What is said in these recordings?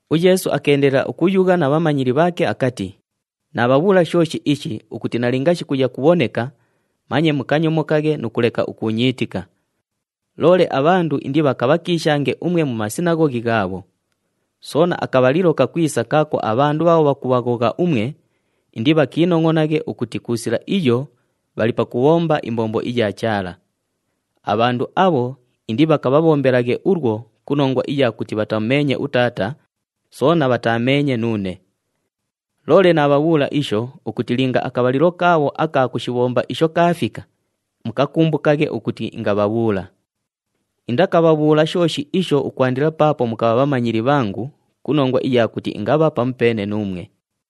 UYeesu akeendelela ukuyugha na bhamanyili bhaake akati, “Naabhabhuula shooshi ishi ukuti nalinga shikuya kubhoneka, manye mukanyomokaghe nu kuleka ukuunyiitika. Loole abhandu indibhakabhakiishange umwe mu masinaghoghi ghaabho. Soona, akabhalilo kakwisa kaako abhandu bhaabho bhakubhaghogha umwe, indibhakiinongʼonaghe ukuti ku sila iyo bhali pakubhomba imbombo iya Chaala. Abhandu abho indibhakabhabhombelaghe ulwo ku nongwa iya kuti bhatamumeenye uTaata, soona bhataameenye nuune. Loole naabhabhuula isho ukuti linga akabhalilo kaabho aka kushibhomba isho kaafika, mukakumbukaghe ukuti ingabhabhuula. Indakabhabhuula shooshi isho ukwandila paapo mukabha bhamanyili bhangu ku nongwa iya kuti ingabha pamupeene nuumwe.”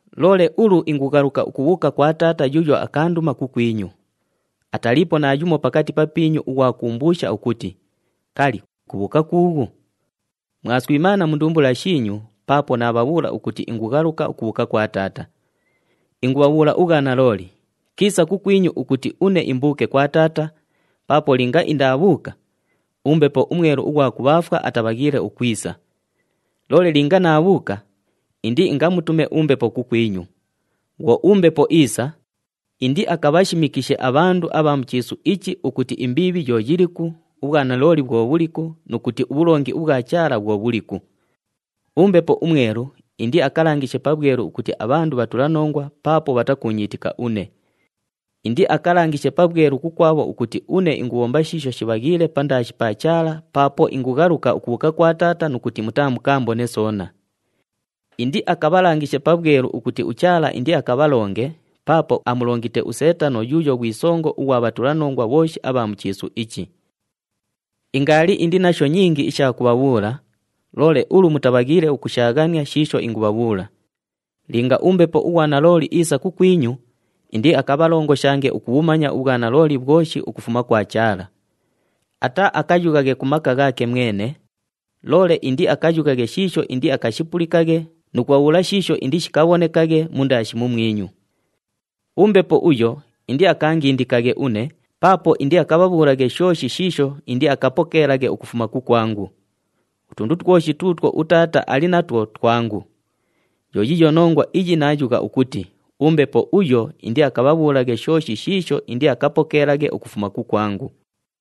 “Loole ulu ingughaluka ukubhuuka kwa Taata yuuyo akaanduma kukwinyu. Ataliipo naayumo pakati papiinyu ughwa kuumbuusha ukuti, ‘Kali, kubhuuka kuughu?’ Mwaswimaana mu ndumbula shiinyu paapo naabhabhuula ukuti ingughaluka ukubhuuka kwa Taata. Ingubhabhuula ubhwanalooli, kiisa kukwinyu ukuti une imbuuke kwa Taata, paapo linga indaabhuuka, uMbepo uMwelu ughwa kubhaafwa atabhaghiile ukwisa. Loole linga naabhuuka, indiingamutume uMbepo kukwinyu. Bhwo uMbepo iisa, indiakabhashimikishe abhandu abha mu chiisu ichi ukuti imbiibhi yo yiliku, ubhwanalooli bhwo bhuliku nu kuti ubhulongi ubhwa Chaala bhwo bhuliku. UMbepo uMwelu indiakalangishe pabhwelu ukuti abhandu bhatulanongwa paapo bhatakuunyiitika une. Indiakalangishe pabhwelu kukwabho ukuti une ingubhomba shiisho shibhaghiile pandaashi pa Chaala paapo ingughaluka ukubhuuka kwa Taata nu kuti mutaamukaambone soona. Indiakabhalangishe pabhwelu ukuti uChaala indiakabhalonge paapo amulongite uSeetano yuuyo ghwi songo ughwa bhatulanongwa bhooshi abha mu chiisu ichi. “Ingaali indi nasho nyingi isha kubhabhuula, loole ulu mutabhaghiile ukushaaghania shiisho ingubhabhuula. Linga uMbepo ughwa nalooli iisa kukwinyu, indiakabhalongoshange ukubhumanya ubhwanalooli bhwoshi ukufuma kwa Chaala. Ataaakayughaghe ku maka ghaake mwene, loole indiakayughaghe shiisho indiakashipulikaghe nu kubhabhuula shiisho indishikabhonekaghe mundaashi mumwinyu. UMbepo uyo indiakaangindikaghe une paapo indiakabhabhuulaghe shooshi shiisho indiakapokeelaghe ukufuma kukwangu. Utundu twoshi tuutwo uTaata ali natwo twangu. Yo yiiyo nongwa iyi naayugha ukuti uMbepo uyo indiakabhabhuulaghe shooshi shiisho indiakapokeelaghe ukufuma kukwangu.”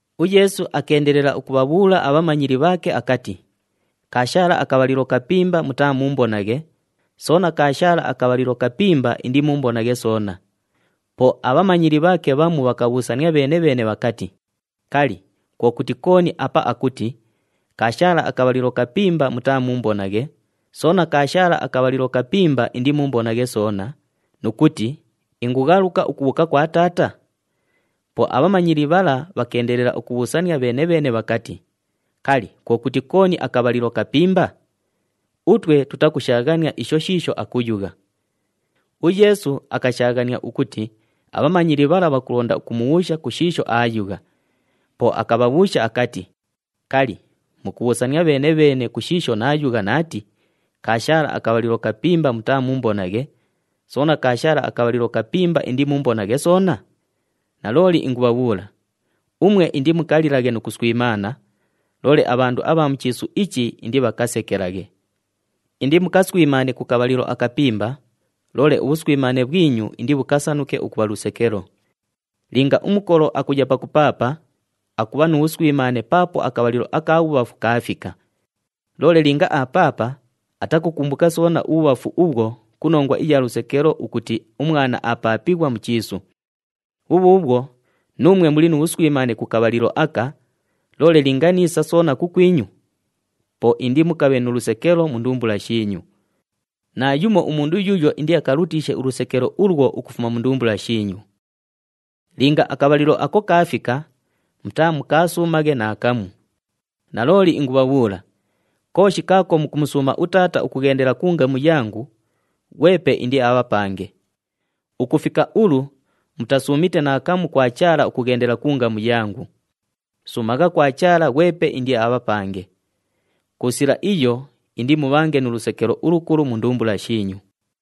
UYeesu akeendelela ukubhabhuula abhamanyili bhaake akati, “Kaashaala akabhalilo kapimba mutaamuumbonaghe, soona kaashaala akabhalilo kapimba indimuumbonaghe soona.” Po abhamanyili bhaake bhamu bhakabhuusania bheene-bheene bhakati, “Kali, kwo kuti kooni apa akuti, ‘Kaashaala akabhalilo kapimba mutaamuumbonaghe, soona kaashaala akabhalilo kapimba indimuumbonaghe soona,’ nu kuti, ‘Ingughaluka ukubhuuka kwa Taata’?” Po abhamanyili bhala bhakeendelela ukubhuusania bheene-bheene bhakati, “Kali, kwo kuti kooni ‘akabhalilo kapimba’? Utwe tutakushaaghania isho shiisho akuyugha.” UYeesu akashaaghania ukuti abhamanyili bhala bhakulonda ukumubhuusha ku shiisho aayugha, po akabhabhuusha akati, “Kali, mukubhuusania bheene-bheene ku shiisho naayugha naati, ‘Kaashaala akabhalilo kapimba mutaamuumbonaghe, soona kaashaala akabhalilo kapimba indimuumbonaghe soona’? Nalooli ingubhabhuula, umwe indimukalilaghe nu kuswimaana, loole abhandu abha mu chiisu ichi indibhakasekelaghe. Indimukaswimaane ku kabhalilo akapimba, loole ubhuswimaane bhwinyu indibhukasanuke ukubha lusekelo. Linga umukolo akuya pakupaapa, akubha nu bhuswimaane paapo akabhalilo aka bhubhafu kaafika. Loole linga aapaapa, atakukumbuka soona ubhubhafu ubhwo ku nongwa iya lusekelo ukuti umwana aapaapighwa mu chiisu. Bhubhuubhwo nuumwe muli nu bhuswimaane ku kabhalilo aka, loole ingwisa soona kukwinyu, po indimukabhe nu lusekelo mu ndumbula shiinyu. Naayumo umundu yuuyo indiakalutiishe ulusekelo ulwo ukufuma mu ndumbula shiinyu. Linga akabhalilo ako kaafika, mutaamukaasuumaghe naakamu. Nalooli ingubhabhuula, kooshi kaako mukumusuuma uTaata ukughendela ku ngamu yangu, ghwepe indiabhapange. Ukufika ulu mutasuumite naakamu kwa Chaala ukughendela ku ngamu yangu. Suumagha kwa Chaala ghwepe indiabhapange. Ku sila iyo indimubhange nu lusekelo ulukulu mu ndumbula shiinyu.”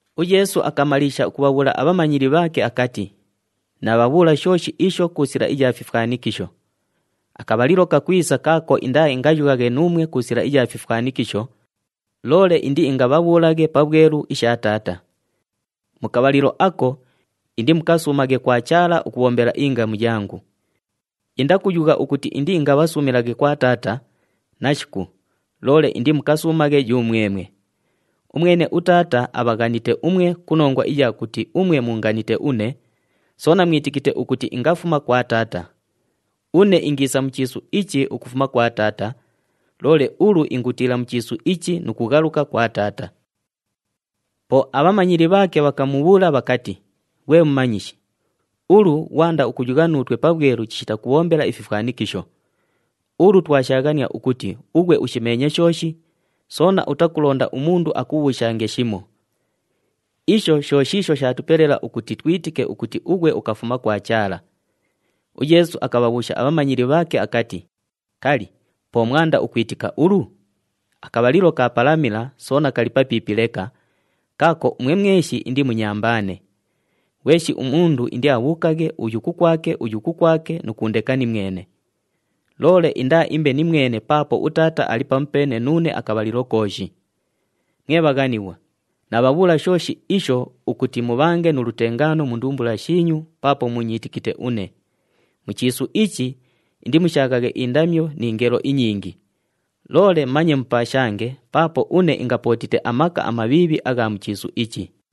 UYeesu akamaliisha ukubhabhuula abhamanyili bhaake akati, “Naabhabhuula shooshi isho ku sila iya fifwanikisho. Akabhalilo kakwisa kaako indaaingayughaghe nuumwe ku sila iya fifwanikisho, loole indiingabhabhuulaghe pabhwelu isha Taata. Mu kabhalilo ako, indimukasuumaghe kwa Chaala ukubhombela ingamu yangu. Indakuyugha ukuti indiingabhasuumilaghe kwa Taata, nashiku, loole indimukasuumaghe yumwemwe. Umwene uTaata abhaghanite umwe ku nongwa iya kuti umwe muunganite une, soona mwitikite ukuti ingafuma kwa Taata. Une ingiisa mu chiisu ichi ukufuma kwa Taata, loole ulu ingutiila mu chiisu ichi nu kughaluka kwa Taata.” Po abhamanyili bhaake bhakamubhuula bhakati, “Ghwe Mumanyishi, ulu ghwanda ukuyugha nuutwe pabhwelu chishita kubhombela ififwanikisho! Ulu twashaaghania ukuti ughwe ushimeenye shooshi, soona utakulonda umundu akubhuushange shimo. Isho sho shiisho shaatupelela ukuti twitike ukuti ughwe ukafuma kwa Chaala.” UYeesu akabhabhuusha abhamanyili bhaake akati, “Kali, po mwanda ukwitika ulu? Akabhalilo kaapalamila soona kali papiipi leka, kaako umwe mweshi indimunyambaane. Ghweshi umundu indiabhuukaghe uyu kukwake uyu kukwake nu kuundeka nimwene. Loole indaaimbe nimwene paapo uTaata ali pamupeene nuune akabhalilo kooshi. Mwe bhaghanighwa, naabhabhuula shooshi isho ukuti mubhange nu lutengaano mu ndumbula shiinyu paapo muunyiitikite une. Mu chiisu ichi indimushaaghaghe indamyo ni ngelo inyingi, loole manye mupaashange paapo une ingapootite amaka amabhiibhi agha mu chiisu ichi.”